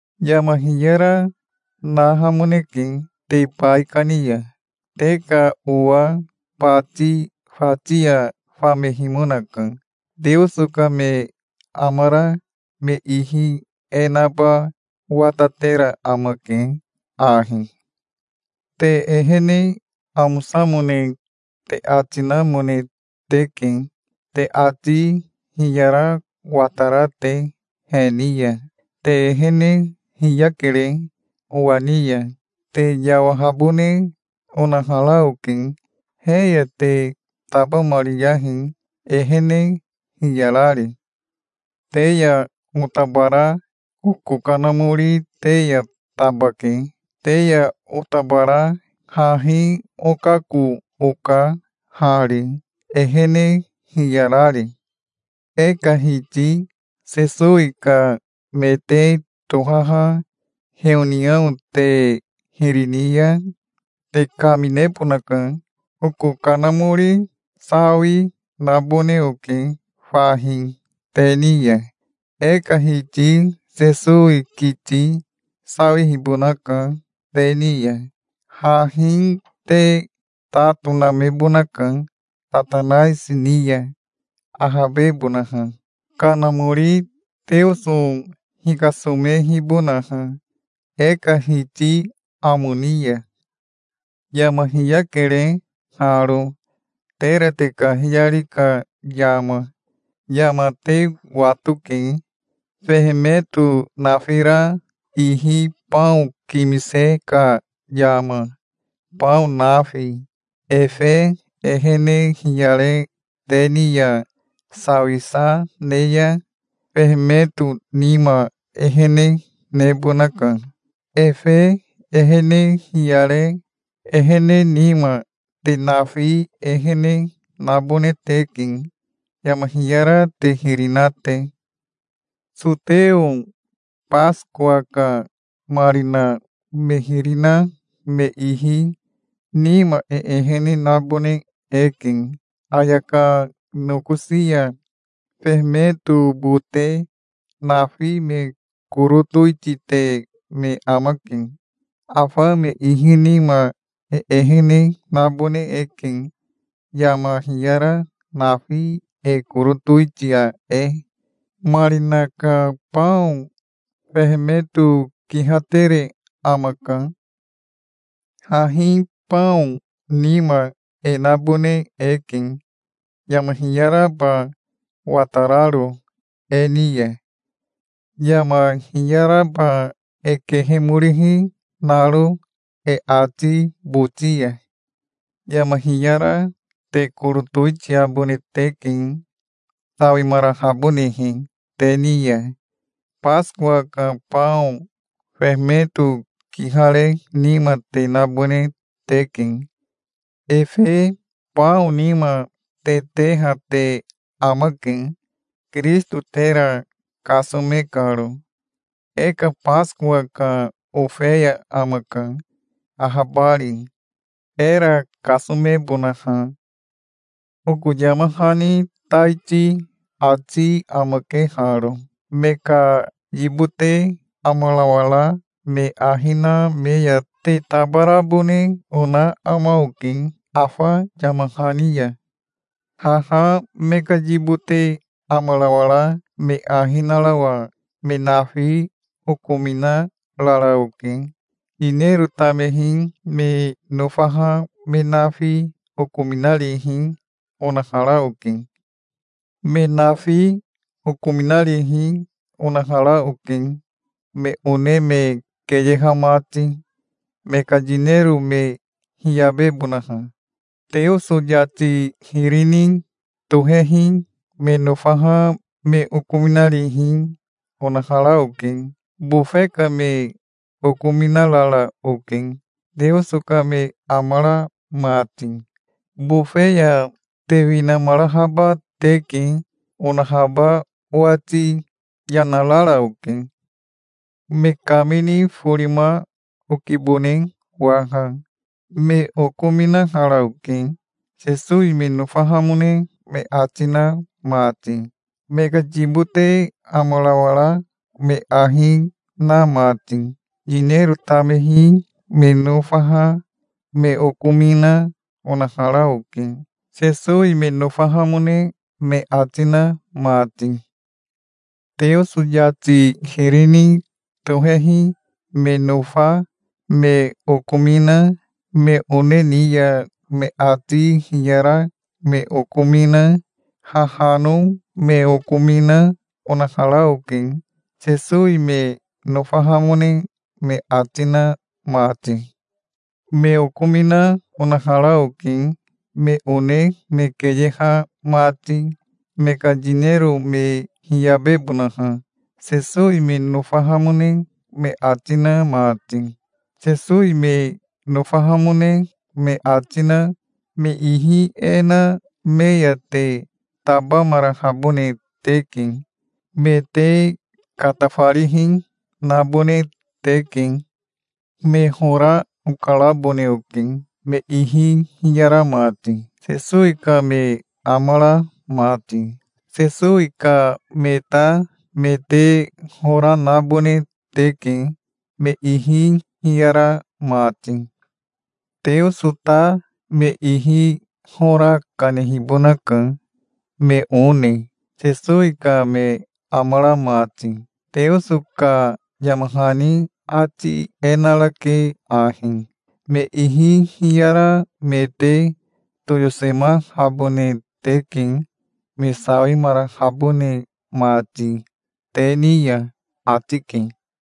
Yama hiyara nahamoneke te baikani ya. Te ka owa bati fati ya famehimonaka. Teoso ka me amara me ihi e naba watatera amake ahi. Te ehene amosamone te ati namone teke, te ati hiyara watara te he ni ya. Te ehene hiyakere owa ni ya. Te yawahabone onahara oke. He ya te tabamariyahi, ehene hiyarari. Te ya otabara oko kanamori te ya tabake. Te ya otabara hahi okako oka hari, ehene hiyarari. E ka Hiti Sesowi ka me te tohaha heoniao te hiri ni ya te kaminebonaka. Oko kanamori sawi, nabone oke fahi te ni ya. E ka Hiti Sesowi kiti sawihibonaka te ni ya. Hahi te ta tonamebonaka Satanaisi ni ya, ahabebonaha, kanamori Teoso hikasomehibonaha e ka Hiti amo ni ya. Yama hiyakere haro, tera te kahiyari ka yama. Yama te watoke, fehemeto nafira ihi bao kimise ka yama, bao nafi. Efe ehene hiyare te ni ya sawisa ne ya fehemeto nima ehene nebonaka. Efe ehene hiyare ehene nima te nafi ehene nabone teke, yama hiyara te hiri na te. Soteo Basikowa ka marina me hiri na me ihi nima e ehene nabone eke. Ayaka nokosi ya fehemeto bote nafi me koro towitite me amake. Afa me ihi nima e ehene nabone eke, yama hiyara nafi e koro towitia e. Marina ka bao fehemeto kihatere amaka. Hahi bao nima e nabone eke, yama hiyaraba watararo e ni ya, yama hiyaraba e kehemorihi naro e ati boti ya. Yama hiyara te koro towitiabone teke, sawimarahabonehe te ni ya. Basikowa ka bao fehemeto kihare nima te nabone teke. Efe bao nima te teha te amake, Kirisito tera kasome karo. E ka Basikowa ka ofeya amaka, ahabari, era kasomebonaha. Oko yama hani taiti ati amake haro: Me ka yibote amarawara me ahi na me ya te tabarabone ona ama oke afa yama hani ya. Haha me ka yibote amarawara me ahi narawa me nafi okominarara oke. Yinero tamehi me nofaha me nafi okominarihi, onahara oke. Me nafi okominarihi onahara oke, me one me keyeha mati, me ka yinero me hiyabebonaha. Teoso yati hiri ni tohehi me nofaha me okominarihi onahara oke. Bofe ka me okominarara oke, Teoso ka me amara mati. "Bofe ya te winamarahaba teke", onahaba owati yana rara oke. Me kamini forima okibone waha. Me okominahara oke, Sesowi me nofahamone me ati na mati, me ka yibote amarawara me ahi na mati. Yinero tamehi me nofaha me okomina, onahara oke, Sesowi me nofahamone me ati na mati. Teoso yati hiri ni tohehi me nofa me okomina, me one ni ya me ati hiyara me okomina, hahano me okomina, onahara oke, Sesowi me nofahamone me ati na mati. Me okomina onahara oke me one me keyeha mati, me ka yinero me hiyabebonaha, Sesowi me nofahamone me ati na mati. Sesowi me nofahamone me ati na me ihi e na me ya te tabamarahabone teke. Me te katafarihi nabone teke. Me hora okarabone oke, me ihi hiyara mati, Sesowi ka me amara mati. Sesowi ka me ta me te hora nabone teke, me ihi hiyara mati. Teoso ta me ihi hora kanehibonaka, me one, Sesowi ka me amara mati. Teoso ka yama hani ati e narake ahi: "Me ihi hiyara me te toyosemahabone teke, me sawimarahabone mati te ni ya", ati ke.